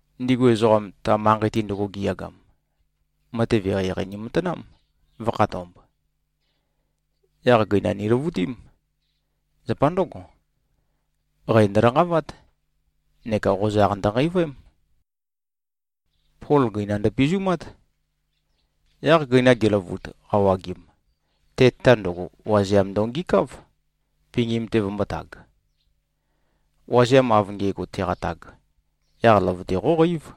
Ndigu ezoqam, ta manqei-te ndøgo giyagam, matev eqeieqei nimatanám, vø̄khatomb. Yaq gøina niløvutím. Zapa ndǿgo, qæ ndølanqavát neka qozaq ndønqeivøém. Pol gøina ndøpizumát. Yaq gøina geløvut, qawagim, te-tata ndøgo, wazeam ndongikáv, pingim-te vømbōtag. Wazeam av nge꞉go teqatag, yaq løvøte qóqeív.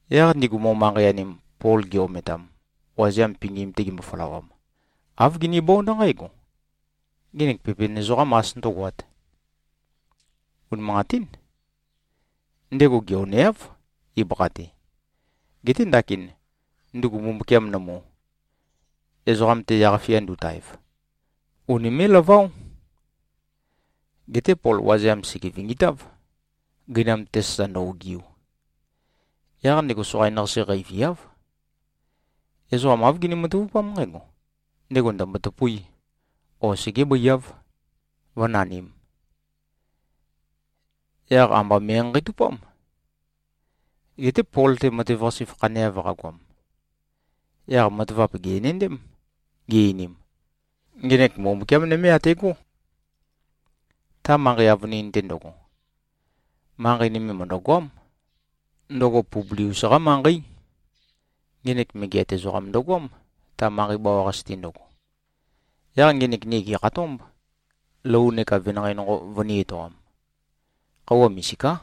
Yaq ndigu mo-manqei-anim, Pol gi-ometam, wazeam pingim-te gembo-følawam, āv ginibónd nqǽgo, “Ngenek pepen ezoqám as ndǿgoát. Unimanqatín. Ndego geoneáv, ibøkha-te. Geté ndakin, ndugu mbumbukiam nømu, ezoqam-te yaq-fia ndutaev, unimé꞉-laváo.” Geté Pol wazeam sège-vingitáv, gøinam-te sasa ndø-ogiu. Yaq ndego soqain-qase qeiviáv. Ezoqa āv gini-matavupám nqǽgo: Ndego ndø̀mbo-tøpuí, o segébøiáv, vǿnanīm. Yaq amba me꞉nqanqeitupám. Geté Pol-te matev-qase fakhaneav qagoam, yaq matavap gè-enendém, gi-einim, “Ngenek mbumbukiám nøme ategó.” Ta manqei avønin-te ndøgo, manqei nøme mø̀ndøgoám. Ndøgo Publius-qá manqeí. Ngenek megeat ezoqam ndøgoám, ta manqei bawa-qase-te ndøgo. Yaq ngenek ni gèkhatómb, lou neka venanqei nonqo vønī-etoam. Khøuwa misiká.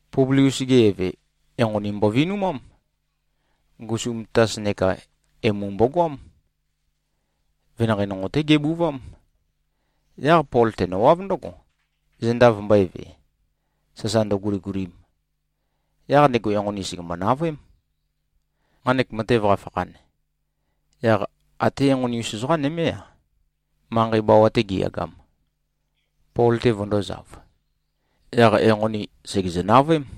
Publius-ge eve, enqoni mbovinumám. Ngusum tatas neka emu mbogoám. Venanqei nonqo-té gebuvám. Yaq Pol tenøwáv ndǿgo, zenda vømbø̄eve, sasa ndøguligulim. Yaq ndego enqoni, sègembo-navøém. Nqanek matev qafakhan, yaq até enqoni-us ezoqa nømé-a, manqei bawa-te giyagam, Pol-te vøndōzav. Yaq enqoni sègezø-navøém.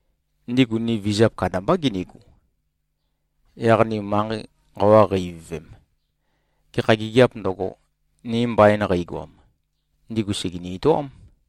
Ndigu ni vizap kandambá ginigu. Yaq ni manqei nqawa qei-ivøvem, gekha gigiāp ndøgo, ni mbain qeigoam, ndigu sègeni-etoám.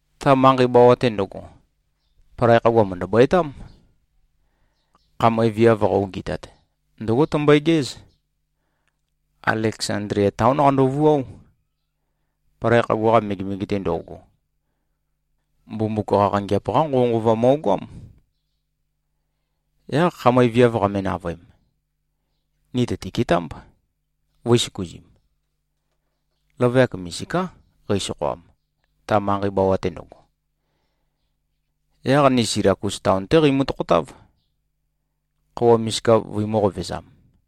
Ta manqei bawa-te ndøgo, palai khagua mø̀ndøbøetám. Khamøe viav qa-ogɨtat, ndǿgo tømbøegéz. Aleksandlia taón qandovuáo. Palai khagua-qa mege-te ndo꞉go, Mbumbuk Qaqangeap-qá nqovønqova mo꞉goám. Yaq khamøe viav qame-navøem, ni tø̀tiketámb, vø̄i-søkuzim. Løvøyak misiká qeisokhoam, ta manqei bawa-te ndøgo. Yaq ni Silakus taon-té qeimø-tokhotáv, khøuwa misika vøimø̄-qovezam.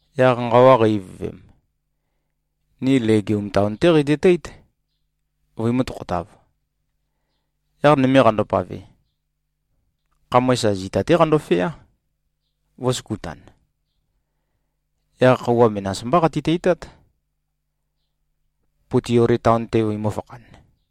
Yaq nqawa qei-ivøvem, ni Legium taon-té qeitøteít, vøimø̄-tokhotav. Yaq nøme qandopave, khamøe sa zita-té qandofeá, vø̄søkutan. Yaq khøuwa menas mbá qati-teitát, Puteoli taon-te vøimø̄-fakhan.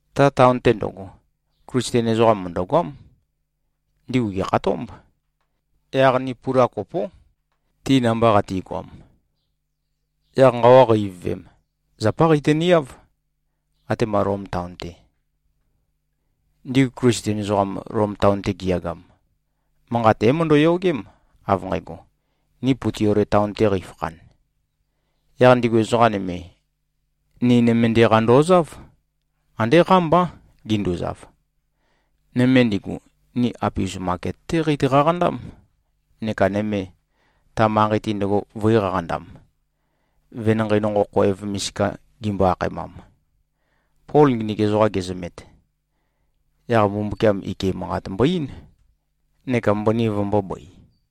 Ta taon-te ndøgo, Klisten ezoqam mø̀ndøgoám. Ndigu gèkhatómb. Yaq ni pula kopó, ti namba qati꞉goam. Yaq nqawa qei-ivøvem, zapá qeitøniáv, atema Lom taon-te. Ndigu Klisten ezoqam, Lom taon-te giyagam, manqat é-møndømø-yogém, av nqægo, ni Puteoli taon-te qeifakhan. Yaq ndigu ezoqa nøme, ni nømende-qa ndozáv. Andé qámbá, ginduzav. Nøme ndigu, ni Apius maket-té qeitø-qaqandám neka nøme, ta manqei-te ndøgo, vø̄i-qaqandam, Venanqei Nonqo Khoev Misika gimbo-akhaemam. Pol nginik ezoqa gezømet, yaq Mbumbukiam ike manqat mbo-eín, neka mbøni vømbōbøi.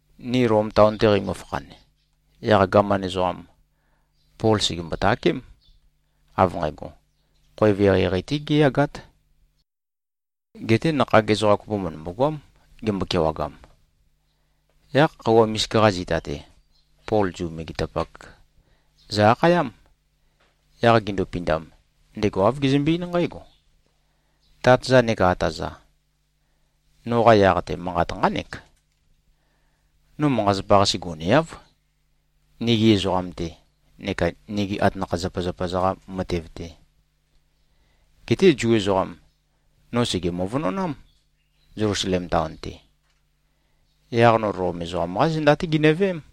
Ni Lom taon-te qeimø-fakhan, yaq gaman ezoqam, Pol sègembo-takém, av nqægo, khoev eqeieqei-té géyagát. Geté nakhag ezoqa kopo mø̀ndømbo-goám, gembo-kewagam. Yaq khøuwa misika-qa zita-te, Pol Zu megetapak zø-akhayám. Yaq gindupindam, ndego āv gezømbe-eín nqǽgo, “Tát-za neka ata-za. Noqa yaq-te, manqat nqánek: No manqa-zapa-qase goneáv, nigi ezoqam-te neka nigi atanakha-zapazapa-za-qa matev-te. Geté Zu ezoqam, no sège-møvønonám, Zelusalem taon-te. Yaq no Lom ezoqam-qá zenda-té ginøveém.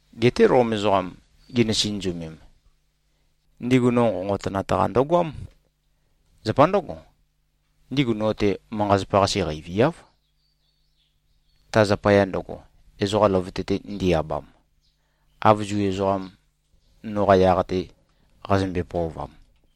Geté Lom ezoqam ginø-sinøzumem, ndigu no nqonqotønat-qa ndøgoám. Zapa ndǿgo, ndigu no-te manqa-zapa-qase qeiviáv, ta zapaya ndøgo, ezoqa løvøte-te ndi-abam, av Zu ezoqam noqa yaq-te qazømbe-pøovam.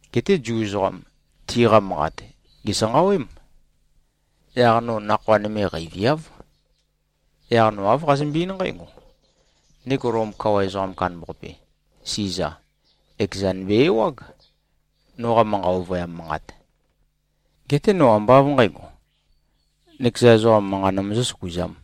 Geté Zu ezoqam, tiqa manqat gèsanqawém. Yaq no nakhoa nøme qeiviáv. Yaq no āv qazømbe-eín nqǽgo: Ndego Lom kawa ezoqam kandambaqape, Siza, ekezan be-ewág, noqa manqa ovøyam manqat. Geté no ambá av nqǣgo, nøkeza ezoqam manqa nømøzø̄-søkuzām.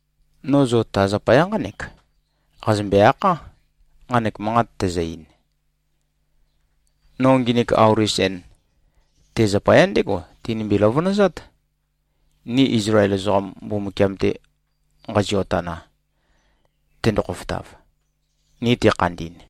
No zo ta zapaya nqánek qazømbe-akhá, nqanek manqat tæzø-ein. No nginik auli sen, te zapaya ndégo tinømbe-løvønøzat, ni Izlael ezoqam, Mbumbukiam-te nqazio-tana, tendo-khofotav, ni tekhandi꞉n.”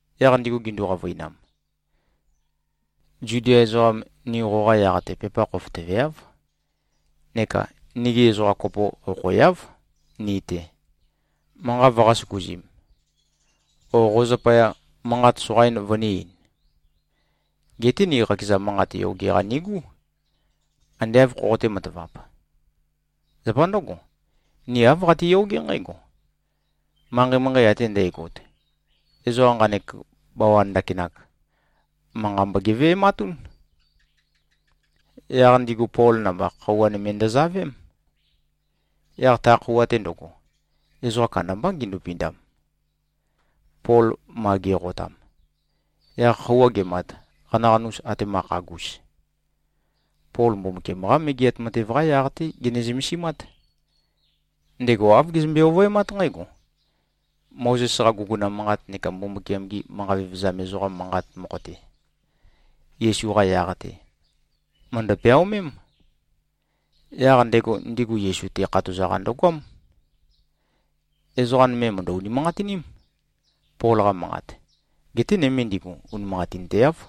Yaq ndigu gindu-qavøinam, “Zudia ezoqam, ni qoqa yaq-te pepa khofotøveáv. Neka nigi ezoqa kopo okhoeáv, ni-te, manqa vøqā-søkuzim, o qo zapaya, manqat soqain vønī-ein. Geté ni qakeza manqat yoge-qa nigú, ande āv khoqotē-matavap. Zapa ndǿgo, ni āv qatiyogé nqǽgo: Manqei-manqei ate ndægot, ezoqa nqanek bawan ndakinak, manqa mbogeve꞉matún.” Yaq ndigu Pol namba, khøuwa nøme ndøzavém. Yaq ta khøuwa-te ndøgo, ezoqa kandambá gindupindam, Pol ma ge꞉qotam. Yaq khøuwa gemat, qanaqanus atéma khagus, Pol Mbumbukiam-qá Megeat Matev-qá yaq-té gene-zømesimát. Ndego āv gezømbe-ovøemát nqǽgo: Mozes-qa guguna manqat neka Mbumbukiam-gi manqa vevezam ezoqam-qa manqat mokho-te, Yesu-qa yaq-te, mø̀ndø-peaomém. Yaq ndego ndigu Yesu-te khatoza-qa ndøgoám. Ezoqa nøme, mø̀ndø-unimanqatiním, Pol-qa manqat. Geté nøme ndigu, unimanqatinteáv.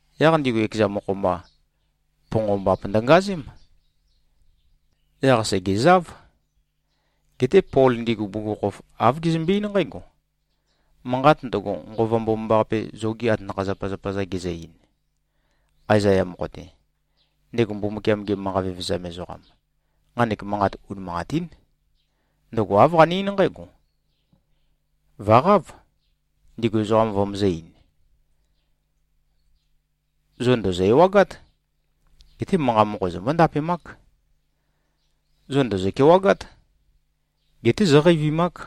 Yaq ndigu ekeza mokho-mba, ponqombap ndønqazém. Yaq sègezáv. Geté Pol ndigu bugukhokhof, āv gezømbe-eín nqǽgo, “Manqat ndøgo, Nqova Mbomambaqape zogi atanakha-zapazapa-za gezø-ein, Aezaya mokho-te, ndego Mbumbukiam-ge manqa vevezam ezoqam, nqanek manqat unimanqatín. Ndøgo āv qane-eín nqǽgo, ‘Vø̀qáv, ndigu ezoqam vømøzø̄-ein: Zo ndòzo-ewagát. Geté manqa mokho zombó-ndapemák. Zo ndòzo-kewagát. Geté zóqeivimák.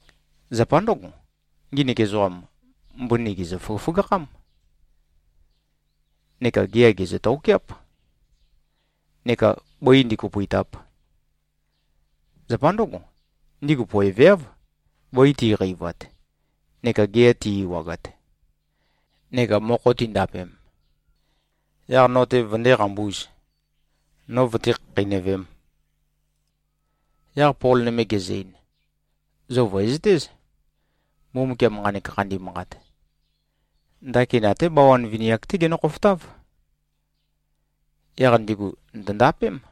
Zapa ndǿgo, nginik ezoqam, mbøni gèzø-føgøføgakhám, neka gea gèzø-tokeáp, neka bǿi ndīkōpø̄ītāp. Zapa ndǿgo, ndigu poeveáv, bøi ti꞉qeivat neka gea ti꞉-ewagat, neka mokho tindapem, yaq no-te vøndé-qambūz, no vøté-khakheinøvēm.’” Yaq Pol nøme gezø-ein, “Zo vø̀ezøtéz. Mbumbukiam nqanek khandi manqat, ndakin até bawan vini-ak-té genø-khofotáv. Yaq ndigu ndø̀ndapém.”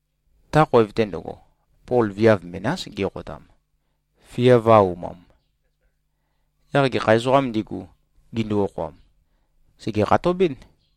Ta khoev-te ndøgo, Pol viav menás geqotam, fia vø̄-aumam. Yaq gekha ezoqām ndigu, gindu-okhoam, sège-khatobɨ́n.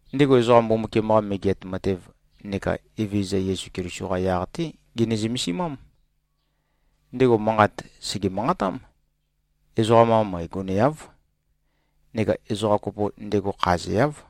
Ndego ezoqa Mbumbukiam-qa Megeat Matev neka Evezøza Yesu Keliso-qa yaq-té gene-zømesimám. Ndego manqat sège-manqatám. Ezoqam-qa møe goneáv. Neka ezoqa kopo ndego khazeáv.